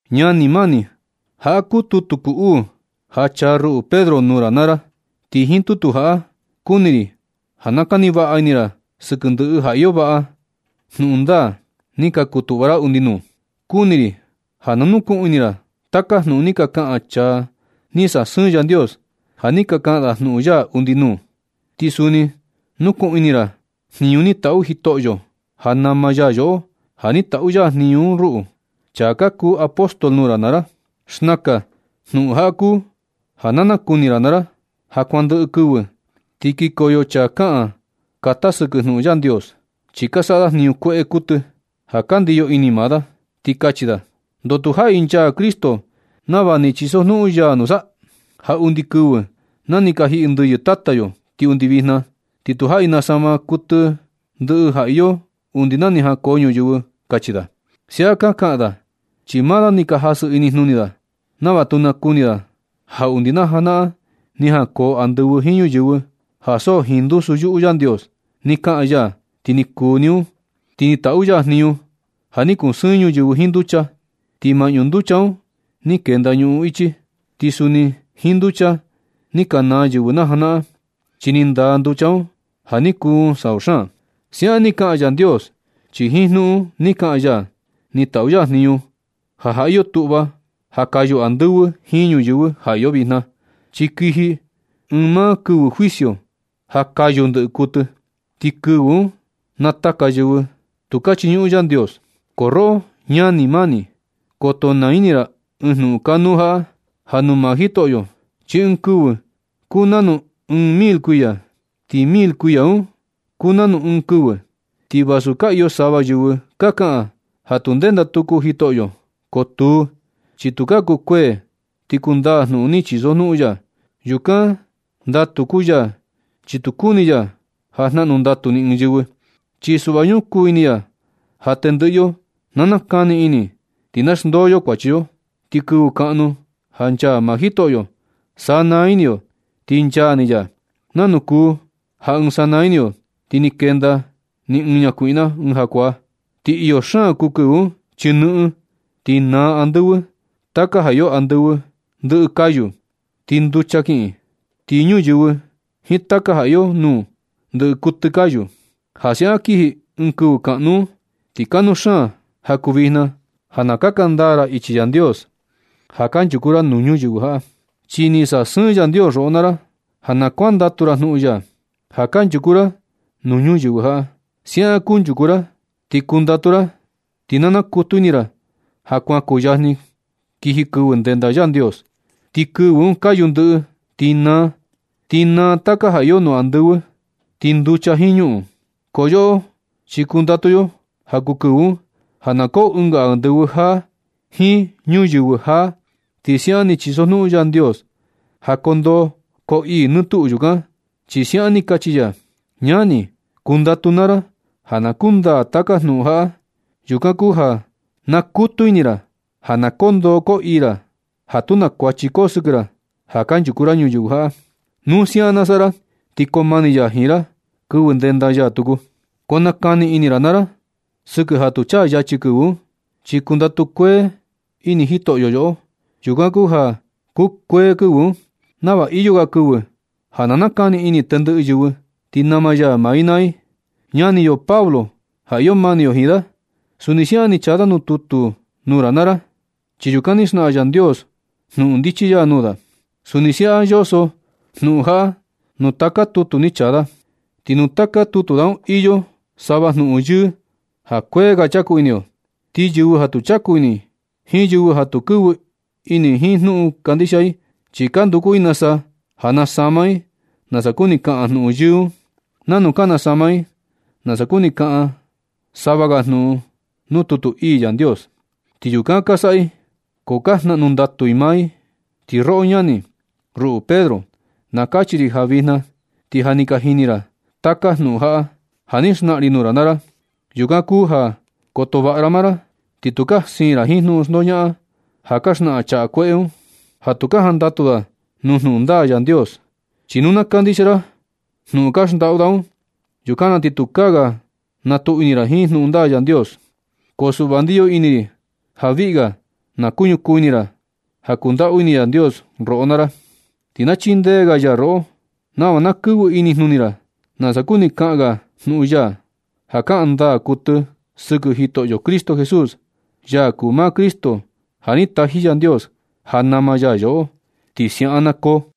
Ñani mani, jaꞌa kuu tutu kuu uu ja chaa ruꞌu Pedro, nuu ra naa ra. Ti jiin uu tutu jaꞌa kuni ri ja na kani vaꞌa ini ra sɨkɨ ndɨꞌɨ ja iyo vaꞌa jnuꞌun ndaa ni ka kutuꞌva ra undi nuu. Kuni ri ja na nukuꞌun ini ra taka jnuꞌun ni ka kaꞌan chaa ni sasɨɨn Yandios ja ni ka kaꞌan da jnuꞌun ya undi nuu. Ti suni nukuꞌun ini naa ra jniñu ni taꞌu Jitoꞌo, ja nama ya yoꞌo, ja ni taꞌu ya jniñu un ruꞌu, chaa ka kuu apóstol nuu ra naa ra. Xnakan jnuꞌun jaꞌa kuu ja na nakuni ra naa ra: Ja nu kuan ndɨꞌɨ kɨvɨ ti kikoyo chaa kaꞌan kata sɨkɨ jnuꞌun ndaa Yandios, chi ka saꞌa da jniñu kueꞌe kuɨtɨ ja ka ndiyo ini maa da. Ti kachi da: “¿Ndoo tu jaꞌi nchaa Cristo nava ni chisojnuꞌun ya nusa? Ja undi kɨvɨ na ni ka jiꞌi ndɨyɨ tata yo ti undi vijna, ti tu jaꞌi nasama kuɨtɨ ndɨꞌɨ ja iyo undi na ni jankoo ñuyɨvɨ”, kachi da. Siaꞌan ka kaꞌan da chi maa da ni ka jasɨ inijnuni da, nava tu nakuni da ja undi na janaꞌan ni jankoo andɨvɨ jiin ñuyɨvɨ, ja so jiin ndusu yuꞌu Yandios ni kaꞌan ya ti ni kuu ni un. Ti ni taꞌu ya jniñu ja ni kusɨɨn ñuyɨvɨ jiin nducha, ti maꞌñu nducha un ni kenda ñuꞌun ichi. Ti suni jiin nducha ni ka naa yɨvɨ na janaꞌan, chi ni ndaa nducha un ja ni kuun sau xaan. Siaꞌan ni kaꞌan Yandios, chi jiin jnuꞌun ni kaꞌan ya ni taꞌu ya jniñu ja ja iyo tuꞌva ja kayu andɨvɨ jiin ñuyɨvɨ ja iyo vijna. Chi kiji ɨɨn maa kɨvɨ juicio ja kayu ndɨꞌɨ kuɨtɨ. Ti kɨvɨ un naa taka yɨvɨ tu ka chiñuꞌun Yandios. Ko roꞌo ñani mani, koto naa ini ra ɨɨn jnuꞌun kanuu jaꞌa: Ja nuu maa Jitoꞌo, chi ɨɨn kɨvɨ kuu nanu ɨɨn mil kuiya, ti mil kuiya un kuu nanu ɨɨn kɨvɨ. Ti vasu ka iyo sava yɨvɨ ka kaꞌan ja tu ndenda tuku Jitoꞌo. Ko tuu, chi tukaa kukuee ti kundaa jnuꞌun ni chisojnuꞌun ya. Yukan ndatu kuu ya chi tu kuni ya ja jnaꞌnu ndatu ni ɨɨn yo. Chi suꞌva ñukuu ini ya ja tendɨꞌɨ yo na nakani ini, ti na xndoo yo kuachi yo. Ti kɨvɨ kaꞌnu ja nchaa maa Jitoꞌo, sanaa ini yo ti nchaa ni ya, nanu kuu ja ɨɨn sanaa ini yo ti kenda ni ɨɨn ñakuiꞌna ɨɨn jakuaa. Ti iyo xaan kuu kɨvɨ un chi nɨꞌɨn, ti naa andɨvɨ. Taka ja iyo andɨvɨ ndɨꞌɨ kayu ti nducha kiꞌin. Ti ñuyɨvɨ jiin taka ja iyo nuu, ndɨꞌɨ kuɨtɨ kayu. Ja siaꞌan kiji ɨɨn kɨvɨ kaꞌnu un, ti kanuu xaan ja kuu vijna ja na kaka ndaa ra ichi Yandios ja kanchuku ra nuu ñuyɨvɨ jaꞌa. Chi ni sasɨɨn Yandios roꞌo naa ra ja na kuandatu ra jnuꞌun ya ja kanchuku ra nuu ñuyɨvɨ jaꞌa. Siaꞌan kunchuku ra, ti kundatu ra, ti na nakutu ini ra ja kuan kuyajni kiji kɨvɨ ndenda Yandios. Ti kɨvɨ un kayu andɨvɨ ti naa. Ti naa taka ja iyo nuu andɨvɨ, ti nducha jiin ñuꞌun. Ko yoꞌo chi kundatu yo ja kuu kɨvɨ un ja na koo ɨnga andɨvɨ jaa jiin ñuyɨvɨ jaa, chi siaꞌan ni chisojnuꞌun Yandios. Ja koo ndoo koo ii nɨ tuꞌu yukan, chi siaꞌan ni kachi ya. Ñani, kundatu naa ra ja na kundaa taka jnuꞌun jaꞌa. Yukan kuu ja na nakutu ini ra ja na koo ndoo koo ii ra ja tu na kuachi koo sɨkɨ ra ja kanchuku ra ñuyɨvɨ jaꞌa. Nu siaꞌan na saꞌa ra, ti koo mani ya jiin ra kɨvɨ ndenda ya tuku. Ko na kani ini ra naa ra sɨkɨ ja tu chaa yachi kɨvɨ un, chi kundatu kuee ini Jitoꞌo yoꞌo. Yukan kuu ja kukuee kɨvɨ un, nava iyo ga kɨvɨ ja na nakani ini tendɨꞌɨ yɨvɨ ti nama ya maa i naa i. Ñani yo Pablo ja iyo mani yo jiin da, suni siaꞌan ni chaa da tutu nuu ra naa ra, chi yukan ni xnaꞌan Yandios jnuꞌun ndichi ya nuu da. Suni siaꞌan yoso jnuꞌun jaꞌa nuu taka tutu ni chaa da. Ti nuu taka tutu da un iyo sava jnuꞌun yɨɨ ja kuee ga chaku ini yo. Ti yɨvɨ ja tu chaku ini jiin yɨvɨ ja tu kɨvɨ ini jiin jnuꞌun kandixia i, chi ka nduku i nasa, ja nasama i nasa kuni kaꞌan jnuꞌun yɨɨ un, nanu ka nasama i nasa kuni kaꞌan sava ga jnuꞌun nuu tutu ii Yandios. Ti yukan ka saꞌa i ko ja na jnaꞌnu ndatu maa i naa i. Ti roꞌo ñani, ruꞌu Pedro, na kachi ri ja vijna ti ja ni ka jini ra taka jnuꞌun jaꞌa, ja ni xnaꞌan ri nuu ra naa ra. Yukan kuu ja koto vaꞌa ra maa ra, ti tukaa siin ra jiin jnuꞌun xndoñaꞌan ja ka xnaꞌan chaa kueꞌe un, ja tu ka jandatu da nuu jnuꞌun ndaa Yandios. Chi nu na kandixia ra jnuꞌun ka xndaꞌu da un, yukan na ti tukaa ga nakutu ini ra jiin jnuꞌun ndaa Yandios. Ko suꞌva, ndiyo ini ri ja viꞌi ga na kuñukuu ini ra ja kundaꞌu ini Yandios roꞌo naa ra, ti na chindee ga ya roꞌo nava na kɨvɨ inijnuni ra nasa kuni kaꞌan ga jnuꞌun ya, ja kaꞌan ndaa kuɨtɨ sɨkɨ Jitoꞌo Jesús, ya kuu maa Cristo ja ni taji Yandios ja nama ya yoꞌo. Ti siaꞌan na koo.